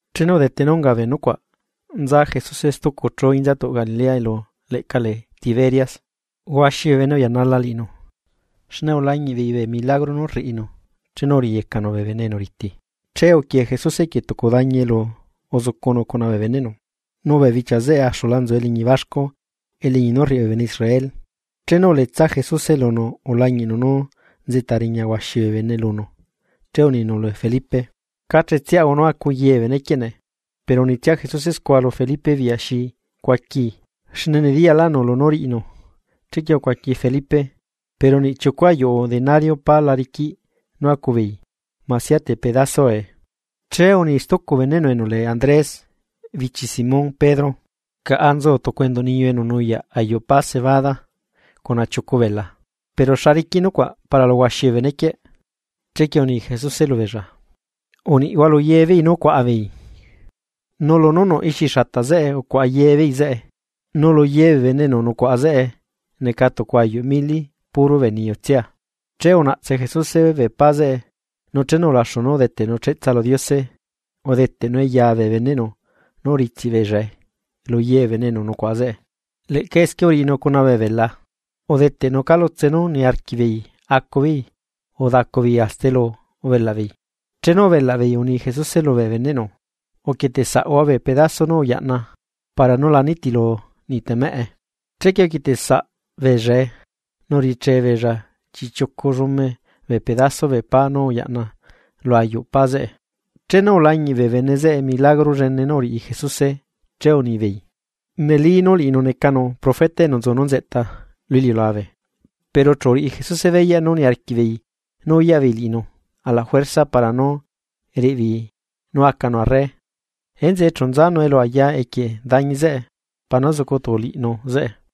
Chenu udete nú unga bee nucuaꞌ, nza Jesuse stucu chú inzatuꞌ Galilea, elu leꞌca lee Tiberias. Huaxi bee bene uyanala liꞌinu, xne ulañiꞌbeei bee milagro nú rriꞌinu, chenu uriꞌiyecanu bee bene enu riti. Che uquie Jesuse equie tucu dañi elu uzucunu cuna bee beneꞌnu. Nu bee bichia zeꞌe axula nzu eliñi baxcu, eliñi nú rriꞌi bee bene Israel. Chenu uletsa Jesuse lunu ulañiꞌnu nú nzeꞌta riña huaxi bee bene lunu, che uninu lu Felipe: ―¿Cá chetsiaꞌahua nú acu ye bee benequieꞌ nee? Pero unitsia Jesuse scua lu Felipe biꞌya xi cuaquii, xne nediyalaꞌnu lunú riꞌinu. Chequie ucuaqui Felipe: ―Pero niꞌ chiucu ayuꞌu denario pá la riquiꞌ nú acu beei masia te pedasoae. Che uni stucu beneꞌnu enu lee Andrés, bichi Simón Pedro: ―Caꞌa nzu tucu enduꞌ niyu enu nuyaꞌ ayuꞌ pá cebada cuna chiucu bela, pero ¿xa riquiꞌ nucuaꞌ para lu huaxi bee benequieꞌ? Chequie uni Jesuse lubeella: ―Uniꞌhua lu ye beei nú cuaꞌa beei. Nu lunú nuꞌ ixi xata zeꞌe ucuaꞌa yebeei zeꞌe, nulu yebee bene enu nucuaꞌa zeꞌe neca tucu ayuꞌ mili puro bee niyutsia. Che unaꞌtse Jesuse bee pá zeꞌe, nu chenu ulaxu nú udeteꞌnu cheꞌtsa lu Diose, udeteꞌnue ya bee beneꞌnu nu uritsiꞌ beellae luye bee bene enu nucuaꞌa zeꞌe. Leꞌca esquie uriꞌinu cuna bee bela, udeteꞌnu calutse nú uniarquiꞌbeei acubeei nu udacu beei hasta elu ubelaꞌ beei. Chenu ubelaꞌ beei uni Jesuse lubee beneꞌnu: ―Uquieteꞌ saꞌhua bee pedaso nú uyaꞌna, para nú la nitilu niꞌtemeꞌe. Chequie uquietesaꞌ beellae, nu uriche beella chiꞌchiucu llume bee pedaso bee pá nú uyaꞌna lu ayuꞌ pá zeꞌe. Chenu ulañiꞌ bee bene zeꞌe milagro llene nú uriꞌi Jesuse, che unibeei: ―Neli nú liꞌinu necanu profeta enu nzu nú nzeꞌta lu iliulabe. Pero chu uriꞌi Jesuse beyaꞌ nú niarquiꞌ beei nú uyaꞌ beei liꞌinu ala juerza para nú riꞌi beei nú acanu arre, enzeꞌe chu nzanu elu aya equie dañi zeꞌe, para nú zucu tuculiꞌinu zeꞌe.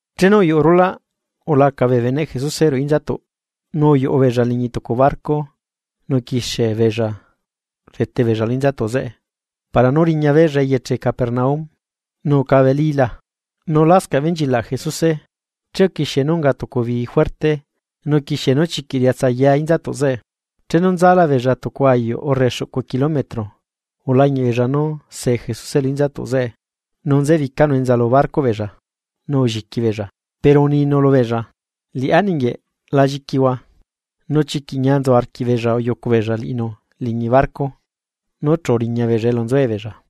Chenu uyuꞌu rulaꞌ, ulaca bee beneꞌ Jesuse ruꞌu inzatuꞌ. Nu uyuꞌu beella liñi tucu barco nu uquixie beella rdete beella lu inzatuꞌ zeꞌe para nú riña beella eyeche Capernaum. Nu ucabelila, nu lascaꞌ benchilaꞌ Jesuse. Che uquixie nú unga tucu bii juerte, nu uquixie nú chiquiꞌ riatsaya inzatuꞌ zeꞌe. Chenu nzala beella tucu ayuꞌ urre xuꞌcu kilometro, ulañiꞌ beella nú see Jesuse lu inzatuꞌ zeꞌe nu nzebicanu enza lu barcoꞌ beella, nu ulliqui beella. Pero uninu lubeella: ―¡Liꞌá ninguieꞌ, la lliquihua! Nu chiquiꞌ ñia nzu arquiꞌbeella uyucu beella liꞌinu liñi barco, nu chu uriña beella elu nzuebeella.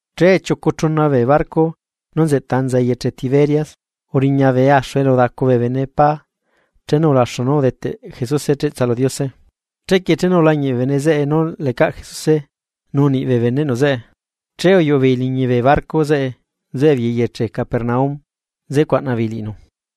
Che chiucu chuna bee barco nú nzeꞌta enza eyeche Tiberias, uriña bee axu elu udacu bee bene pá chenu ulaxu nú udeteꞌ Jesuse cheꞌtsa lu Diose. Chequie chenu ulañiꞌ bee bene zeꞌe nú lecaꞌ Jesuse nu niꞌ bee beneꞌnu zeꞌe, che uyuꞌu beei liñi bee barco zeꞌe nzuebeei eyeche Capernaum nze cuaꞌna beei liꞌinu.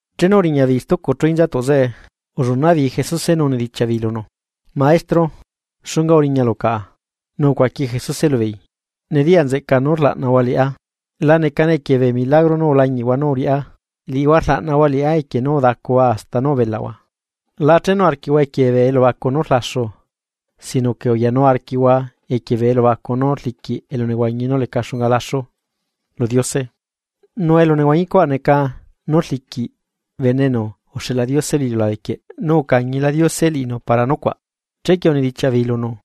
Chenu uriña beei stucu chú inzatuꞌ zeꞌe, ullunaꞌ beei Jesuse nu unidichiaꞌ beei lunu: ―Maestro, ¿xunga uriñalu caꞌa? Nu ucuaqui Jesuse lubeei: ―Nediya nzeꞌcaa nú rlaꞌnahua liꞌá, la necane equie bee milagro nú ulañiꞌhua nú uriꞌá, liꞌihua rlaꞌnahua liꞌá equie nú udacuhua hasta nú ubelaꞌhua. La chenu arquiꞌhua equie bee elubacu nú rlaxu, sino que uyanu arquiꞌhua equie bee elubacu nú rliquiꞌ elunehuañi nú leca xunga laxu lu Diose. Nu elunehuañi cuaꞌ neca nú rliquiꞌ Bene enu uxeꞌla Diose lu iliulabe quieꞌ, nu ucañila Diose liꞌinu para nucuaꞌ. Chequie unidichiaꞌ beei lunu: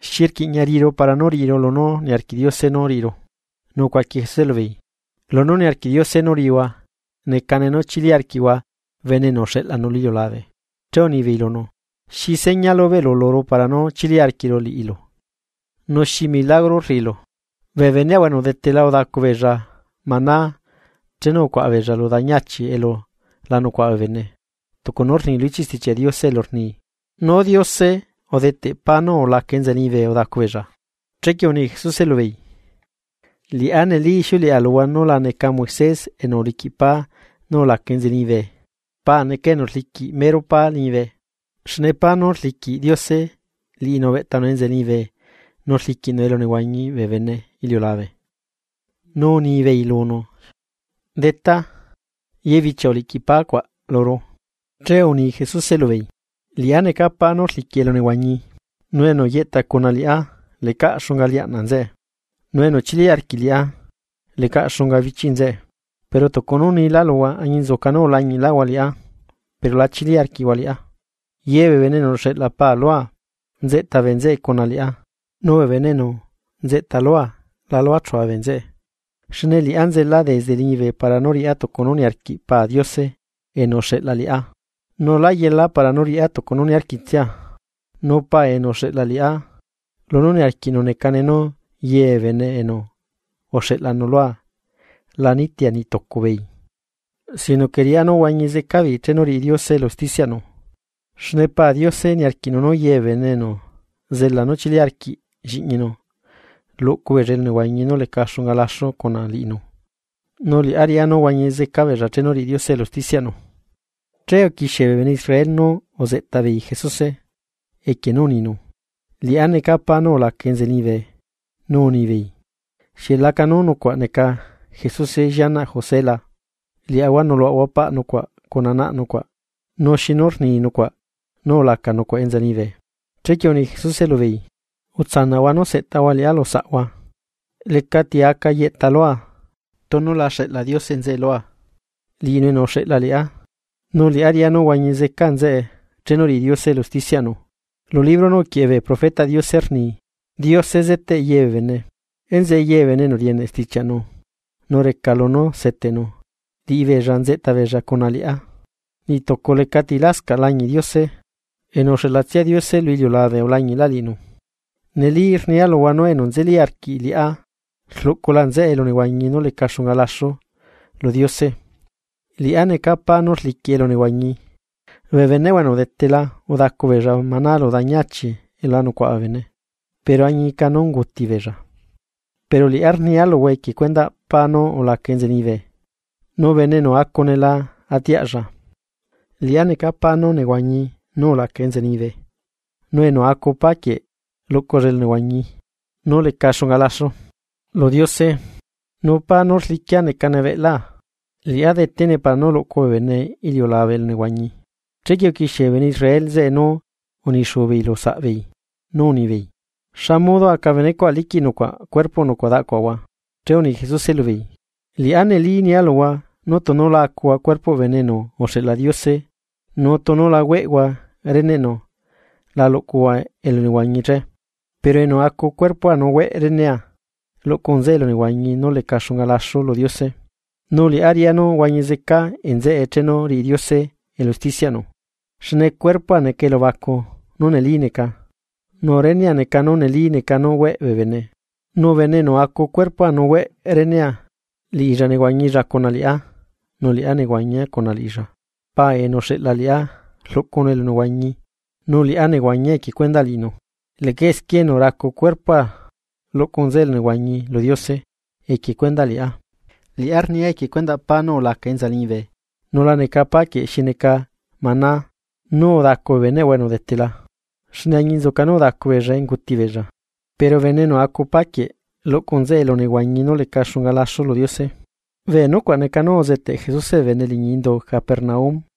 ―¿Xi rquiꞌña riꞌiru para nú riꞌiru lunú niarquiꞌ Diose nú riꞌiru? Nu ucuaqui Jesuse lubeei: ―Lunú niarquiꞌ Diose nú riꞌihua, necane nú chili arquiꞌhua Bene enu uxeꞌlanu lu iliulabe. Che unibeei lunu: ―¿Xi seña lubeꞌlu luru para nú chili arquiꞌru liꞌilu? ¿Nu xi milagro rriꞌilu? Bee beneꞌahua enu udetela udacu beella maná chenu ucuaꞌa beella lu dañi achi elu la nucaꞌa bee bene, tucu nú rni lu ichiꞌ Stichiaꞌ Diose elu rni: “Nú Diose udeteꞌ pá nú ulaca enza liñibe udacu beella.” Chequie uni Jesuse lubeei: ―Liꞌá neli ixiuleꞌa luhua nú la neca Moisés enu uliquiꞌ pá nú ulaca enza liñibe, Pa neca enu rliquiꞌ mero pá liñibe. Xne pá nú rliquiꞌ Diose, liꞌinu ubeꞌtanu enza liñibe nu rliquiꞌnu elunehuañiꞌ bee bene iliulabe. Nu unibeei lunu: ―Detá, ye bichia uliꞌquiꞌ pá cuaꞌ luru. Che uni Jesuse lubeei: ―Liꞌá neca pá nú rliquiꞌ elunehuañi. Nu enu yeꞌta cuna liꞌá lecaꞌ xunga liaꞌnaꞌ nzeꞌe. Nu enu chili arquiꞌ liꞌá, lecaꞌ xunga bichiꞌ nzeꞌe. Pero tucu nú unilá luhua, añinzuca nú ulañiꞌlaꞌhua liꞌá pero la chili arquiꞌhua liꞌá. Ye bee bene enu uxeꞌla Paa lua, nzeꞌta bee nzeꞌe cuna liꞌá, nu bee bene enu nzeꞌta lua, la luachua bee nzeꞌe. Xne liꞌá nzela desde liñibe para nú riꞌá tucu nú niarquiꞌ Pa Diose enu uxeꞌla liꞌá, nu lá yela para nú riꞌá tucu nú niarquitsia. Nu Pa enu uxeꞌla liꞌá, lunú niarquiꞌnu necane nú ye bee bene enu uxeꞌlanu lua la nitia niꞌ tucu beei, sino que riꞌá nú huañi zeca beei chenu riꞌi Diose elu usticiaꞌnu. Xne Pa Diose niarquiꞌnu nú ye bee bene enu zela nú chili arquiꞌ Lliꞌñinu, luꞌcu beella elunehuañi nú leca xunga laxu cuna liꞌinu. Nu liꞌá riꞌá nú huañi zeca beella chenu riꞌi Diose elu usticiaꞌnu. Che uquixie bee bene Israel nú uzeꞌta beei Jesuse, equie nú uninu: “Liꞌá neca pá nú ulaca enza liñibe.” Nu unibeei: ―¿Xieꞌ lacanú nucuaꞌ neca Jesuse llianaꞌ José la? Liaꞌahua nuꞌluꞌahua paꞌ nucuaꞌ cuna naꞌ nucuaꞌ. Nu ¿xinu rni nucuaꞌ nú ulaca nucuaꞌ enza liñibe? Chequie uni Jesuse lubeei: ―Utsanaꞌhua nú seꞌtahua liꞌá lusaꞌhua. Lecati aca yeꞌta lua, tunu la xeꞌla Diose nzeꞌe lua. Liꞌinu enu uxeꞌla liꞌá, nu liꞌá riꞌá nú huañi zeca nzeꞌe chenu riꞌi Diose elu usticiaꞌnu. Lu libro nú uquieꞌe bee profetaꞌ Diose rni: “Diose zeteꞌ ye bee bene.” Enzeꞌe ye bee enu rieneꞌ stichiaꞌnu, nu reca lunú seteꞌnu, liꞌibeella nzeꞌta beella cuna liꞌá. ’Niꞌ tucu lecati lascaꞌ lañiꞌ Diose, enu uxeꞌlatsia Diose lu iliulabe ulañiꞌlaꞌ liꞌinu. Neli rnia luhua nú enu nzeli arquiꞌ liꞌá, rluꞌcula nzeꞌe elunehuañi nú leca xunga laxu lu Diose. Liꞌá neca pá nú rliquiꞌ elunehuañi. Bee beneꞌhua enu udetela udacu beella maná lu dañi achi elu la nucuaꞌa bee bene, nu añica nú unguti beella; pero liꞌá rnia luhua equie cuendaꞌ pá nú ulaca enza liñibe, nu bene enu acune la atiaꞌlla. Liꞌá neca pá nú nehuañi nú ulaca enza liñibe, nu enu acu pá quieꞌ, luꞌculla elunehuañi nú leca xunga laxu lu Diose. Nu pá nú rliquia necane cuerpoa. Liꞌá detene para nú luꞌcu bee bene iliulabe elunehuañi. Chequie uquixie bee bene Israel zeꞌe nú unixuu beei lu saꞌbeei, nú unibeei: ―¿Xamodo aca benecuaꞌ liquiꞌ nucuaꞌ cuerpoꞌ nucuaꞌ daꞌcuaꞌahua? Che uni Jesuse lubeei: ―Liꞌá neli nia luhua nú tunu la acuhua cuerpoꞌ Bene enu uxeꞌla Diose nu tunu la hueꞌhua reneꞌnu la luꞌcuhua elunehuañi che. Pero enu acu cuerpoa nu hueꞌ renea, luꞌcu nzeꞌe elunehuañi nú leca xunga laxu lu Diose, nu liꞌá riꞌá nú huañi zeca nzeꞌe chenu riꞌi Diose elu usticiaꞌnu. Xne cuerpoa neca elubacu nú neli neca, nu renea neca nú neli neca nú hueꞌ bee bene. Nu bene enu acu cuerpoa nu hueꞌ renea, liꞌilla nehuañilla cuna liꞌá, nu liꞌá nehuañia cuna liꞌilla. Pa liñibe enu uxeꞌla liꞌá rluꞌcunu elunehuañi, nu liꞌá nehuañia equie cuendaꞌ liꞌinu. Leꞌca esquie enu racu cuerpoa luꞌcu nzeꞌe elunehuañi lu Diose equie cuendaꞌ liꞌá. Liꞌá rnia equie cuendaꞌ pá nú ulaca enza liñibe. Nu la neca pá quieꞌ xi neca maná nú udacu bee beneꞌhua enu udetela, xne añinzuca nú udacu beellae unguti beella, pero bene enu acu páquieꞌ luꞌcu nzeꞌe elunehuañi nú leca xunga laxu lu Diose. Bee nucuaꞌ neca nú uzeteꞌ Jesuse bee bene liñi indu Capernaum.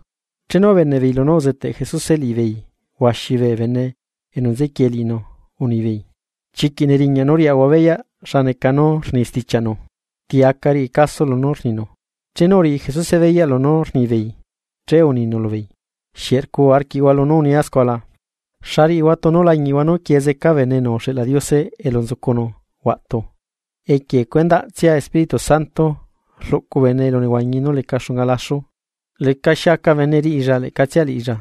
Chenu ubeneꞌ beei lunú uzeteꞌ Jesuse liꞌibeei huaxi bee bene enu nzequie liꞌinu unibeei: ―Chiquiꞌ neriñaꞌ nú riꞌahua beyaꞌ xa neca nú rni stichiaꞌnu. ¿Ti aca riꞌi caso lunú rninu? Chenu uriꞌi Jesuse beyaꞌ lunú rnibeei, che uninu lubeei: ―¿Xieꞌ rcuu arquiꞌhua lunú unia scua la? ¿Xa riꞌihua tunu lañiꞌhua nú quie zeca Bene enu uxeꞌla Diose elu nzucunu huaꞌtu? Equie cuendaꞌtsia Espíritu Santo rluꞌcu bene elunehuañi nú leca xunga laxu, lecaxi aca bene riꞌilla leꞌcatsia liꞌilla.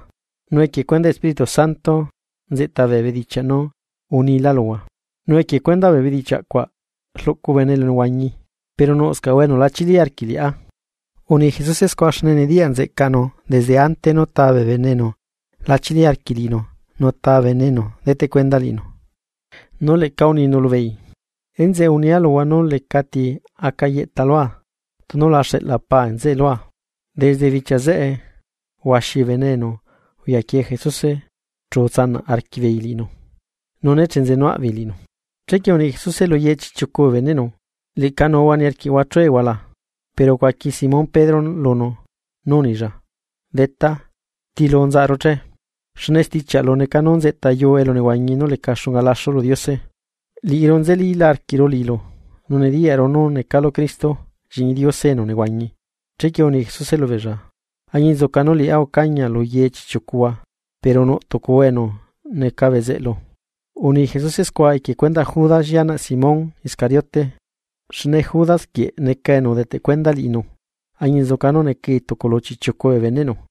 Nu equie cuendaꞌ Espíritu Santo nzeꞌta bee bedichiaꞌ nú unilá luhua, nu equie cuendaꞌ bee bedichiaꞌ cuaꞌ rluꞌcu bene elunehuañi. Pero nuꞌscaꞌhua enu la chili arquiꞌ liꞌá. Uni Jesuse scua xne nediyaꞌ nzeꞌcaꞌnu desde ante nú taa bee bene enu la chili arquiꞌ liꞌinu, nu ta bene enu deteꞌ cuenda liꞌinu. Nu leꞌca uninu lubeei: ―Enzeꞌe unia luhua nú lecati aca yeꞌta lua, tunu la xeꞌla Pa liñibe nzeꞌe lua. Desde bichia zeꞌe, huaxi bee bene enu uyaquie Jesuse chu utsanaꞌ arquiꞌbeei liꞌinu, nu nechenzenuaꞌbeei liꞌinu. Chequie uni Jesuse lu ye chiꞌchiucu bee beneꞌnu: ―¿Leꞌca nuhua niarquiꞌhua chuehua la? Pero ucuaqui Simón Pedro lunu nú unilla: ―Detá, ¿tilu nzaꞌaru che? Xne stichiaꞌlu neca nú nzeꞌta yuu elunehuañi nú leca xunga laxu lu Diose. Liꞌiru nzelíla arquiꞌru liꞌilu, nu nediyaꞌlaꞌru nú necalu Cristo Lliꞌñi Diose enu nehuañi. Chequie uni Jesuse lubeella: ―Añinzuca nú liꞌá ucañia lu ye chiꞌchiucuhua, pero nuꞌ tucuhua enu neca bezeꞌlu. Uni Jesuse scua, equie cuendaꞌ Judas llianaꞌ Simón Iscariote, xne Judas quieꞌ neca enu udeteꞌ cuenda liꞌinu, añinzuca nú necai tucu lu chiꞌchiucu bee beneꞌnu.